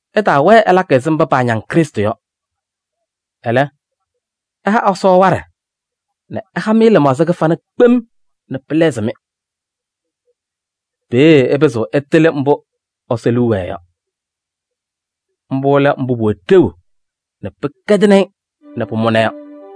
Ɩtaawɛɛ ɩlakɩ ɛzɩ mba paañaŋ Krɩstʋ yɔ. Ɛlɛ, ɩha Ɛsɔ waɖɛ nɛ ɛha-mɩ lɩmaɣza kɩfana kpem nɛ pɩlɛɣzɩ-mɩ. Peeye ɩpɩzɩɣ ɩtɩlɩ mbʋ Ɛsɔ liu wɛɛ yɔ: mbʋ lɛ mbʋ pʋwɛ ɖeu nɛ pɩkɛdɩnɩ-ɩ nɛ pʋmʋna yɔ.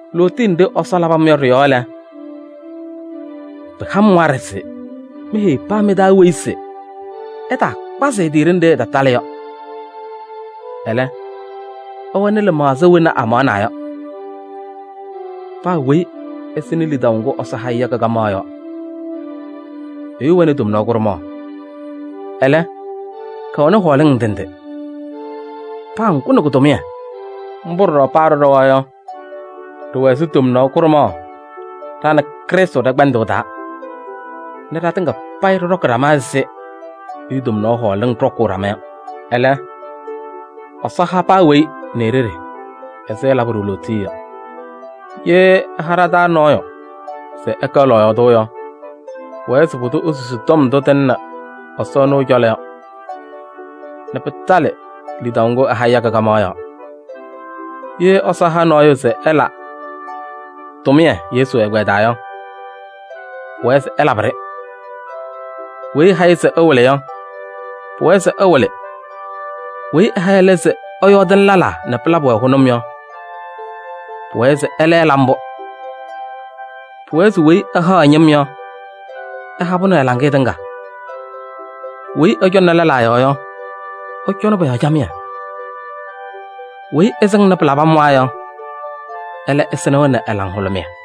Lootiye nɖɩ Ɛsɔ labɩ-m yɔ ɖɩ-yɔɔ lɛ, pɩha-m waɖɛ se meheyi paa mɩ-taa weyi se ɛtaakpazɩ ɛ-tɩ ɖenɖe ɛtatalɩ yɔ. Ɛlɛ, ɛwɛnɩ lɩmaɣza wena amaɣnaa yɔ. Paa weyi ɛsɩnɩ lidaʋ ŋgʋ Ɛsɔ ha-ɩ yɔ kɩ-kamaɣ yɔɔ. Ɛyʋ wɛnɩ tomnaɣ kʋɖʋmaɣ, ɛlɛ, kɛwɛnɩ hɔɔlɩŋ ndɩ ndɩ. Paa ŋgʋ nɛ kʋ-tʋmɩyɛ. Mbʋ ɖɔɖɔ paa ɖɩɖɔwa yɔ, ɖɩwɛ ɛzɩ tomnaɣ kʋɖʋmaɣ ɖa nɛ Krɩstʋ ɖɛ-kpɛndʋʋ taa nɛ ɖatɩŋa payɩ ɖɩɖɔkɩ ɖama ɛzɩ ɛyʋ tomnaɣ hɔɔlɩŋ ɖɔkʋʋnɩ ɖama yɔ. Ɛlɛ, Ɛsɔ ha paa weyi nɛ e-ɖeɖe ɛzɩ ɛlabɩ-ɖʋ lootiye yɔ. Ye ɛha ɖa-taa nɔɔyʋ se ɛkɛ ɛ-lɔɔyaɣ tʋ yɔ, pʋwɛɛ se pʋdʋ esusi tɔm ndʋ tɩlɩnɩ Ɛsɔ ɛnʋ ɛ-cɔlɔ yɔ nɛ pɩtalɩ lidaʋ ŋgʋ ɛha-ɩ yɔ kɩ-kamaɣ yɔɔ. Ye Ɛsɔ ɛha nɔɔyʋ se ɛla tʋmɩyɛ Yesu ɛgbɛyɛ taa yɔ, pʋwɛɛ se ɛlabɩ-ɖɩ. Weyi ɛha-ɩ se ɛwɩlɩ yɔ, pʋwɛɛ se ɛwɩlɩ. Weyi ɛha ɛlɛ se ɛyɔɔdɩnɩ lɛlaa nɛ pɩlabɩ-wɛ hʋnʋm yɔ, pʋwɛɛ se ɛlɛ ɛla mbʋ. Pʋwɛɛ se weyi ɛhaɣ ɛ-ñɩm yɔ, ɛha-pʋ nɛ ɛ-laŋɩyɛ tɩŋa. Weyi ɛcɔŋnɩ lɛlaa yɔɔ yɔ, ɛcɔnɩ pɔ-yɔɔ camɩyɛ. Weyi ɛsɩŋnɩ pɩlabɩmwaa yɔ, ɛlɛ ɛsɩnɩ-wɛ nɛ laŋhʋlʋmɩyɛ.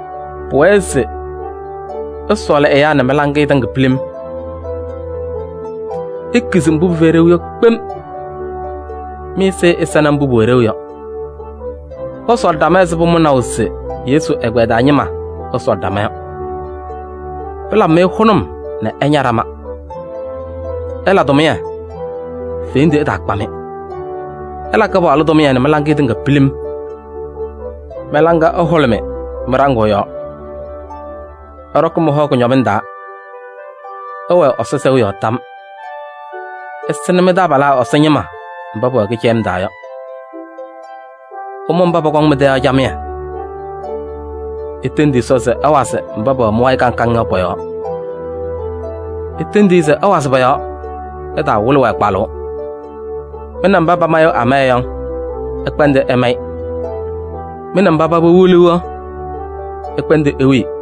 Pʋwɛɛ se ɩsɔɔlɩ ɛyaa nɛ mɩ-laŋɩyɛ tɩŋa pilim. Ikizi mbʋ pɩfɛyɩ ɖeu yɔ kpem. Mɩ-ɛzɩyɛ ɛsɛnɩ mbʋ pʋwɛ ɖeu yɔ. Ɩsɔɔlɩ ɖama ɛzɩ pʋmʋnaʋ se Yesu ɛgbɛyɛ taa ñɩma ɛsɔɔlɩ ɖama yɔ. Pɩlabɩ-mɩ hʋnʋm nɛ ɩña ɖama. Ɩla tʋmɩyɛ, fendu ɛtaakpa-mɩ. Ɩla Kɩpaɣlʋ tʋmɩyɛ nɛ mɩ-laŋa tɩŋa pilim. Mɩ-laŋa ɛhʋlʋmɩ mɩ-ɖaŋʋʋ yɔɔ. Ɩɖɔkɩ mɩ-hɔ kʋñɔmɩŋ taa. Ɩwɛɛ Ɛsɔ sɛʋ yɔɔ tam. Ɩsɩnɩ mɩ-taabalaa Ɛsɔ ñɩma mba pɛwɛ kɩcɛyɩm taa yɔ. Ɩmʋ mba pɔkɔŋ mɩ-tɛ yɔ camɩyɛ. Itendi Ɛsɔ se ɛwazɩ mba pɛwɛ mɩ-wayɩ kaŋ kaŋ yɔ pɔ-yɔɔ. Itendi-i se ɛwazɩ pɔ-yɔɔ, ɩtaawɩlɩ-wɛ kpalʋʋ. Mɩ nɛ mba pamayɩɣ amaya yɔ, ɩkpɛndɩ ɩmayɩ. Mɩ nɛ mba paba wiliɣ yɔ, ɩkpɛndɩ iwili.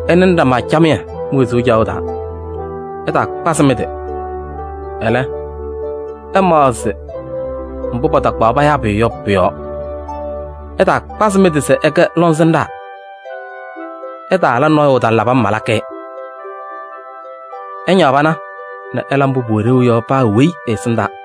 Ɩnɩnɩ ɖama camɩyɛ mi-wezuu caɣʋ taa. Ɩtaakpazɩ mɩ-tɩ, ɛlɛ, ɩmaɣzɩ mbʋ patakpaɣ payaa pʋyʋ yɔ pʋ-yɔɔ. Ɩtaakpaɣ mɩ-tɩ se ɩkɛ lɔŋsɩnɖaa. Ɩtaala nɔɔyʋ taŋ labɩ-m malakɩ-ɩ. Ɩñaɣ pana nɛ ɩla mbʋ pʋwɛ ɖeu yɔ paa weyi ɛ-ɛsɩndaa.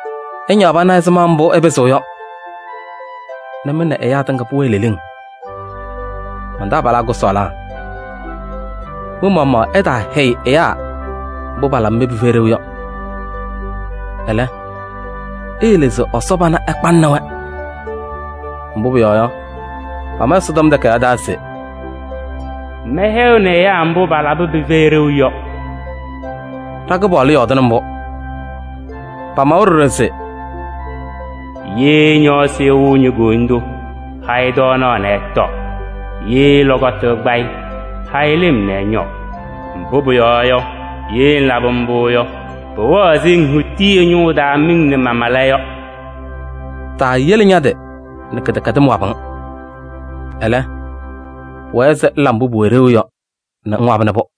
Ɩñaɣ pana ɛzɩma mbʋ ɩpɩzɩɣ yɔ nɛ mɩ nɛ ɛyaa tɩŋa payɩ pʋwɛɛ leleŋ. Man-taabalaa kʋsɔɔlaa, mɩ-maɣmaɣ ɩtaahɛyɩ ɛyaa mbʋ palabɩ-mɩ pɩfɛyɩ ɖeu yɔ. Ɛlɛ, iyele se Ɛsɔ pana ɛkpanɩnɩ-wɛ. Mbʋ pʋyɔɔ yɔ, pama Ɛsɔtɔm Takayaɣ taa se: “Mɛhɛyɩɣnɩ ɛyaa mbʋ palabɩ pɩfɛyɩ ɖeu yɔ.” Ɖa-Kɩpaɣlʋ yɔɔdɩnɩ mbʋ. Pamawa ɖɔɖɔ se: “Ye ñɔɔsɩ ɛwɩɣ ño-koyindu yɔ, ha-ɩ tɔɔnaɣ nɛ ɛtɔɔ. Ye lɔkɔtʋ ɛkpa-ɩ yɔ, ha-ɩ lɩm nɛ ɛñɔɔ. Mbʋ pʋyɔɔ yɔ, ye ŋlabɩ mbʋ yɔ, pʋwɛɣ ɛzɩ ŋhuti ɛ-ñʋʋ taa miŋ nɛ mamala yɔ.” Taayele ña-tɩ nɛ kɩdɛkɛdɩm wabɩ-ŋ. Ɛlɛ, pʋwɛɛ se ŋla mbʋ pʋwɛ ɖeu yɔ nɛ ŋwabɩnɩ-pʋ.